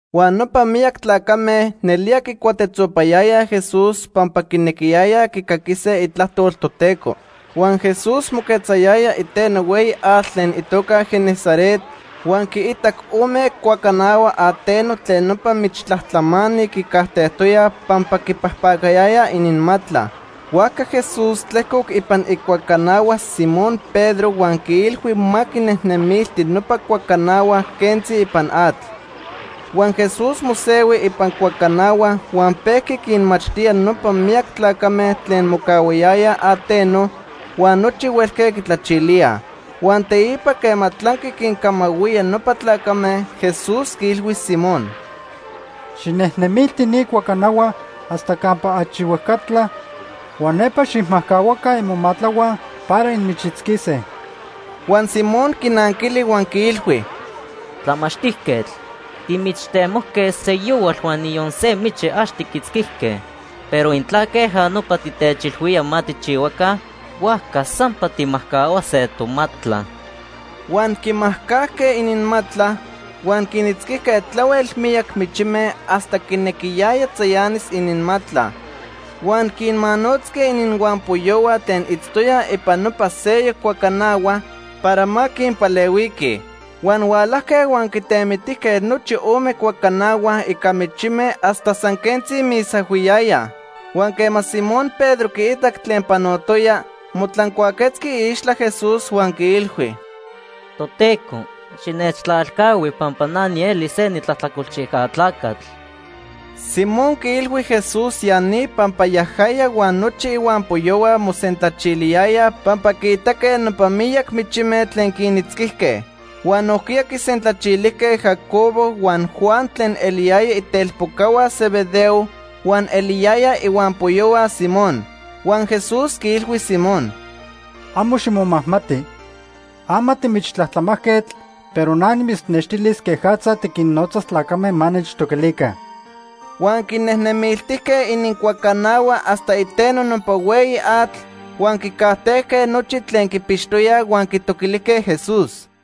Huan nopa miyac tlacame nelía quicuatetzopayayaj Jesús pampa quinequiyayaj quicaquise itlajtol Toteco. Huan Jesús moquetzayaya iteno hueyi atl tlen itoca Genesaret, huan quiitac ome cuacanahua ateno tlen nopa michtlajtlamani quincajtejtoyaj pampa quipajpacayayaj ininmatla. Huajca Jesús tlejcoc ipan icuacanahua Simón Pedro huan quiilhui ma quinejnemilti nopa cuacanahua quentzi ipan atl. Huan Jesús mosehui ipan cuacanahua huan pejqui quinmachtía nopa miyac tlacame tlen mocahuayayaj ateno huan nochi huelque quitlachilíaj. Huan teipa quema tlanqui quincamahuía nopa tlacame, Jesús quiilhui Simón: ―Xijnejnemilti ni cuacanahua hasta campa achi huejcatla huan nepa xijmajcahuaca imomatlahua para inmichitzquise. Huan Simón quinanquili huan quiilhui: ―Tlamachtijquetl, timichtemojque seyohual huan niyon se michi ax tiquitzquijque. Pero intla queja nopa titechilhuía ma tijchihuaca, huajca sampa tijmajcahuase tomatla. Huan quimajcajque ininmatla, huan quinitzquijque tlahuel miyac michime hasta quinequiyaya tzayanis ininmatla. Huan quinmanotzque ininhuampoyohua tlen itztoyaj ipan nopa seyoc cuacanahua para ma quinpalehuiquij. Huan hualajque huan quitemitijque nochi ome cuacanahua ica michime hasta san quentzi misahuiyayaj. Huan quema Simón Pedro quiitac tlen panotoya, motlancuaquetzqui iixtla Jesús huan quiilhui: ―Toteco, xinechtlalcahui pampa na nieli se nitlajtlacolchijca tlacatl. Simón quiilhui Jesús ya ni pampa yajaya huan nochi ihuampoyohua mosentlachiliyayaj pampa quiitaque nopa miyac michime tlen quinitzquijque. Huan nojquiya quisentlachilijque Jacobo huan Juan tlen eliyaya itelpocahua Zebedeo huan eliyayaj ihuampoyohua Simón. Huan Jesús quiilhui Simón: ―Amo ximomajmati. Ama timichtlajtlamajquetl, pero na nimitznextilis quejatza tiquinnotzas tlacame ma nechtoquilica. Huan quinejnemiltijque inincuacanahua hasta iteno nopa hueyi atl, huan quicajtejque nochi tlen quipixtoyaj huan quitoquilijque Jesús.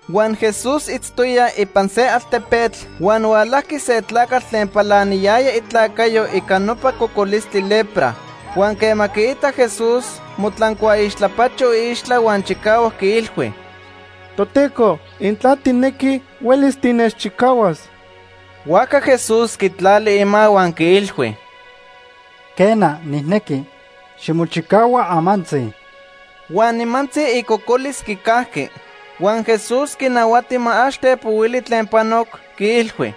Huan Jesús itztoya ipan se altepetl, huan hualajqui se tlacatl tlen palaniyaya itlacayo ica nopa cocolistli lepra. Huan quema quiitac Jesús, motlancuaixtlapacho iixtla huan chicahuac quiilhui: ―Toteco, intla tijnequi, huelis tinechchicahuas. Huajca Jesús quitlali ima huan quiilhui: ―Quena, nijnequi. Ximochicahua amantzi. Huan nimantzi icocolis quicajqui. Huan Jesús quinahuati ma ax tepohuili tlen panoc, quiilhui: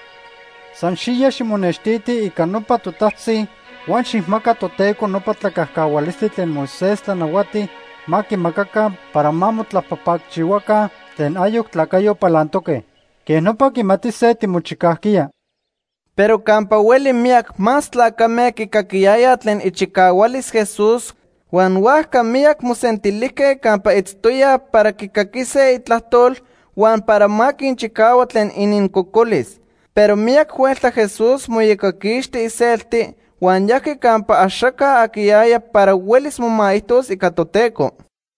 ―San xiya ximonextiti ica nopa totajtzi huan xijmaca Toteco nopa tlacajcahualistli tlen Moisés tlanahuati ma quimacaca para ma motlapajpacchihuaca tlen ayoc tlacayo palantoque. Quej nopa quimatise timochicajquiya. Pero campa hueli miyac más tlacame quicaquiyayaj tlen ichicahualis Jesús huan huajca miyac mosentilijque campa itztoya para quicaquise itlajtol huan para ma quinchicahua tlen inincocolis. Pero miyac huelta Jesús moiyocaquixti iselti huan yajqui campa axaca aquiyaya para huelis momaijtos ica Toteco.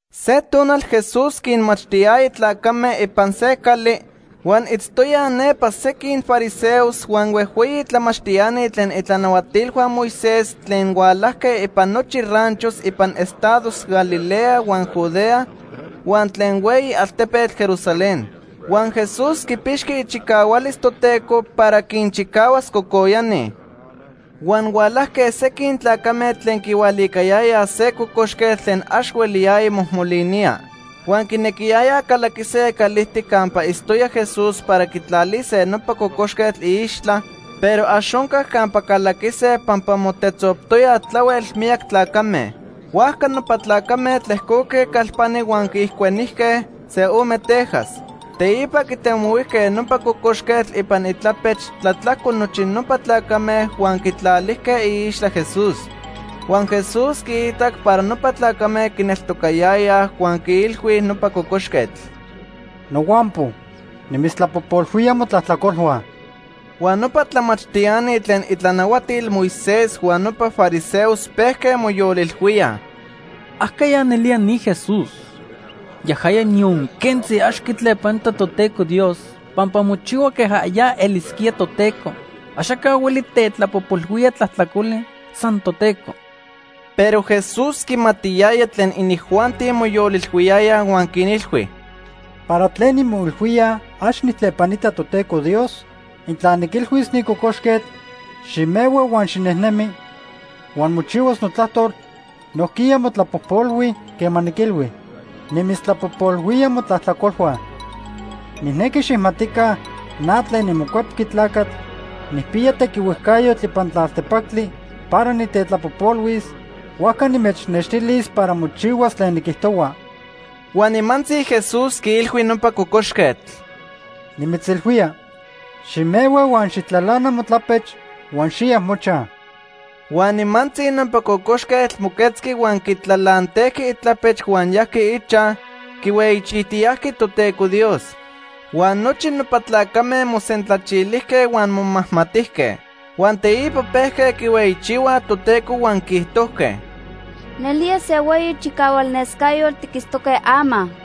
Se tonal Jesús quinmachtiyaya tlacame ipan se cali, huan itztoyaj nepa sequin fariseos huan huejhueyi tlamachtiani tlen itlanahuatilhua Moisés tlen hualajque ipan nochi ranchos ipan estados Galilea huan Judea huan tlen hueyi altepetl Jerusalén. Huan Jesús quipixqui ichicahualis Toteco para quinchicahuas cocoyani. Huan hualajque sequin tlacame tlen quihualicayayaj se cocoxquetl tlen ax hueliyaya mojmolinía. Huan quinequiyayaj calaquise calijtic campa itztoya Jesús para quitlalise nopa cocoxquetl iixtla, pero ax oncac campa calaquise pampa motetzoptoyaj tlahuel miyac tlacame. Huajca nopa tlacame tlejcoque calpani huan quiijcuenijque se ome tejas. Teipa quitemohuijque nopa cocoxquetl ipan itlapech tlatlajco nochi nopa tlacame huan quitlalijque iixtla Jesús. Huan Jesús quiitac para nopa tlacame quineltocayayaj huan quiilhui nopa cocoxquetl: ―Nohuampo, nimitztlapojpolhuía motlajtlacolhua. Huan nopa tlamachtiani tlen itlanahuatil Moisés huan nopa fariseos pejque moyolilhuíaj: “¿Ajqueya nelía ni Jesús? Yajaya niyon quentzi ax quitlepanita Toteco Dios pampa mochihua queja ya elisquía Toteco. Axaca hueli tetlapojpolhuía tlajtlacoli, san Toteco.” Pero Jesús quimatiyaya tlen inijuanti moyolilhuiyayaj huan quinilhui: ―¿Para tlen inmoilhuíaj ax nijtlepanita Toteco Dios? Intla niquilhuis ni cocoxquetl: ‘Ximehua huan xinejnemi’ huan mochihuas notlajtol, nojquiya motlapojpolhui quema niquilhui: ‘Nimitztlapojpolhuía motlajtlacolhua.’ Nijnequi xijmatica na tlen niMocuepqui Tlacatl nijpiya tequihuejcayotl ipan tlaltepactli para nitetlapojpolhuis, huajca nimechnextilis para mochihuas tlen niquijtohua. Huan nimantzi Jesús quiilhui nopa cocoxquetl: ―Nimitzilhuía, ximehua huan xijtlalana motlapech huan xiya mochaj. Huan nimantzi nopa cocoxquetl moquetzqui huan quitlalantejqui itlapech huan yajqui ichaj, quihueyichijtiyajqui Toteco Dios. Huan nochi nopa tlacame mosentlachilijque huan momajmatijque. Huan teipa pejque quihueyichihuaj Toteco huan quiijtojque: ―Nelía se hueyi chicahual nescayotl tiquitztoque ama.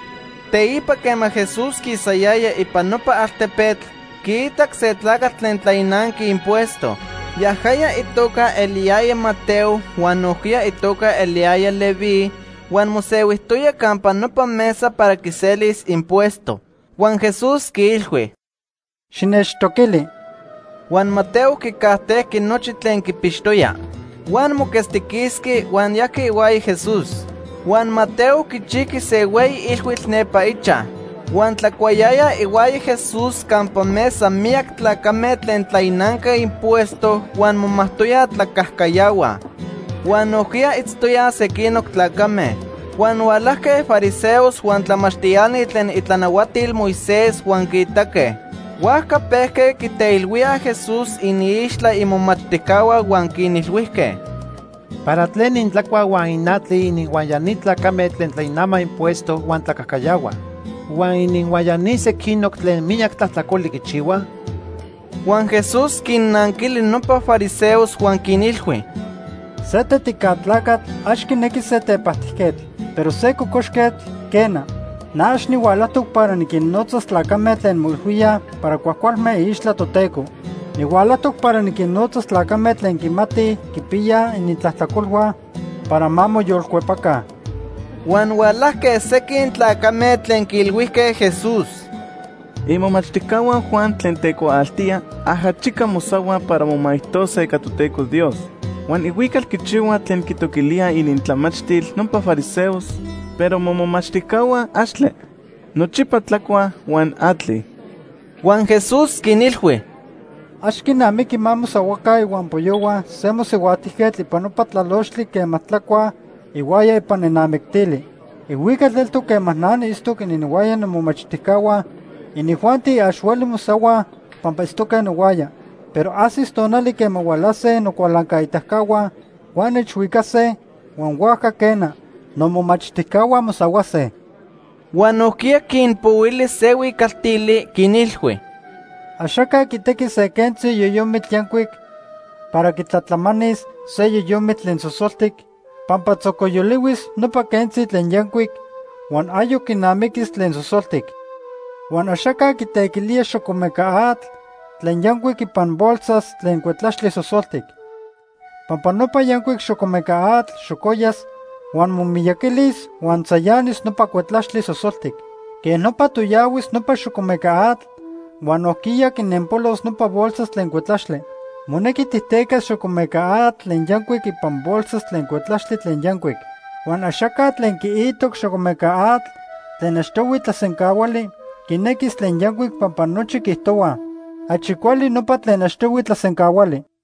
Teipa quema Jesús quisayaya ipan nopa altepetl, quiitac se tlacatl tlen tlainanqui impuesto. Yajaya itoca eliyaya Mateo huan nojquiya itoca eliyaya Leví, huan mosehuijtoya campa nopa mesa para quiselis impuesto. Huan Jesús quiilhui: ―Xinechtoquili. Huan Mateo quicajtejqui nochi tlen quipixtoya. Huan moquetztiquisqui huan yajqui ihuaya Jesús. Huan Mateo quichijqui se hueyi ilhuitl nepa ichaj. Huan tlacuayayaj ihuaya Jesús campa mesa miyac tlacame tlen tlainanque impuesto huan momajtoyaj tlacajcayahuaj. Huan nojquiya itztoyaj sequinoc tlacame. Huan hualajque fariseos huan tlamachtiani tlen itlanahuatil Moisés huan quiitaque. Huajca pejque quiteilhuíaj Jesús iniixtla imomachtijcahua huan quinilhuijque: ―¿Para tlen intlacuaj huan inatlij ininhuaya ni tlacame tlen tlainamaj impuesto huan tlacajcayahuaj? Huan ¿ininhuaya ni sequinoc tlen miyac tlajtlacoli quichihuaj? Huan Jesús quinnanquili nopa fariseos huan quinilhui: ―Se tetica tlacatl ax quinequi se tepajtijquetl, pero se cocoxquetl, quena. Na ax nihualajtoc para niquinnotzas tlacame tlen moilhuíaj para cuajcualme iixtla Toteco. Nihualajtoc para niquinnotzas tlacame tlen quimatij quipiyaj inintlajtlacolhua para ma moyolcuepaca. Huan hualajque sequin tlacame tlen quiilhuijque Jesús: ―Imomachtijcahua Juan tlen tecuaaltía ajachica mosahuaj para momaijtose ica Toteco Dios. Huan ihuical quichihuaj tlen quitoquilíaj inintlamachtil nopa fariseos, pero momomachtijcahua axtle. Nochipa tlacuaj huan atlij. Huan Jesús quinilhui: ―Ax quinamiqui ma mosahuaca ihuampoyohua se mosihuajtijquetl ipan nopa tlalochtli quema tlacuaj ihuaya ipan nenamictili. Ihuical eltoc quema na niitztoc ininhuaya nomomachtijcahua, inijuanti ax huelij mosahuaj pampa itztoque nohuaya. Pero ajsis tonali quema hualase nocualancaitacahua huan nechhuicase huan huajca quena, nomomachtijcahua mosahuase. Huan nojquiya quinpohuili se huicaltili, quinilhui: ―Axaca quitequi se quentzi yoyomitl yancuic para quitlatlamanis se yoyomitl tlen sosoltic pampa tzocoyolihuis nopa quentzi tlen yancuic huan ayoc quinamiquis tlen sosoltic. Huan axaca quitequilía xocomeca atl tlen yancuic ipan bolsas tlen cuetlaxtli sosoltic. Pampa nopa yancuic xocomeca atl xocoyas, huan momiyaquilis huan tzayanis nopa cuetlaxtli sosoltic. Quej nopa toyahuis nopa xocomeca atl huan nojquiya quinenpolos nopa bolsas tlen cuetlaxtli. Monequi tijtecas xocomeca atl tlen yancuic ipan bolsas tlen cuetlaxtli tlen yancuic. Huan axaca tlen quiitoc xocomeca atl tlen achtohui tlasencahuali quinequis tlen yancuic pampa nochi quiijtohuaj: ‘Achi cuali nopa tlen achtohui tlasencahuali.’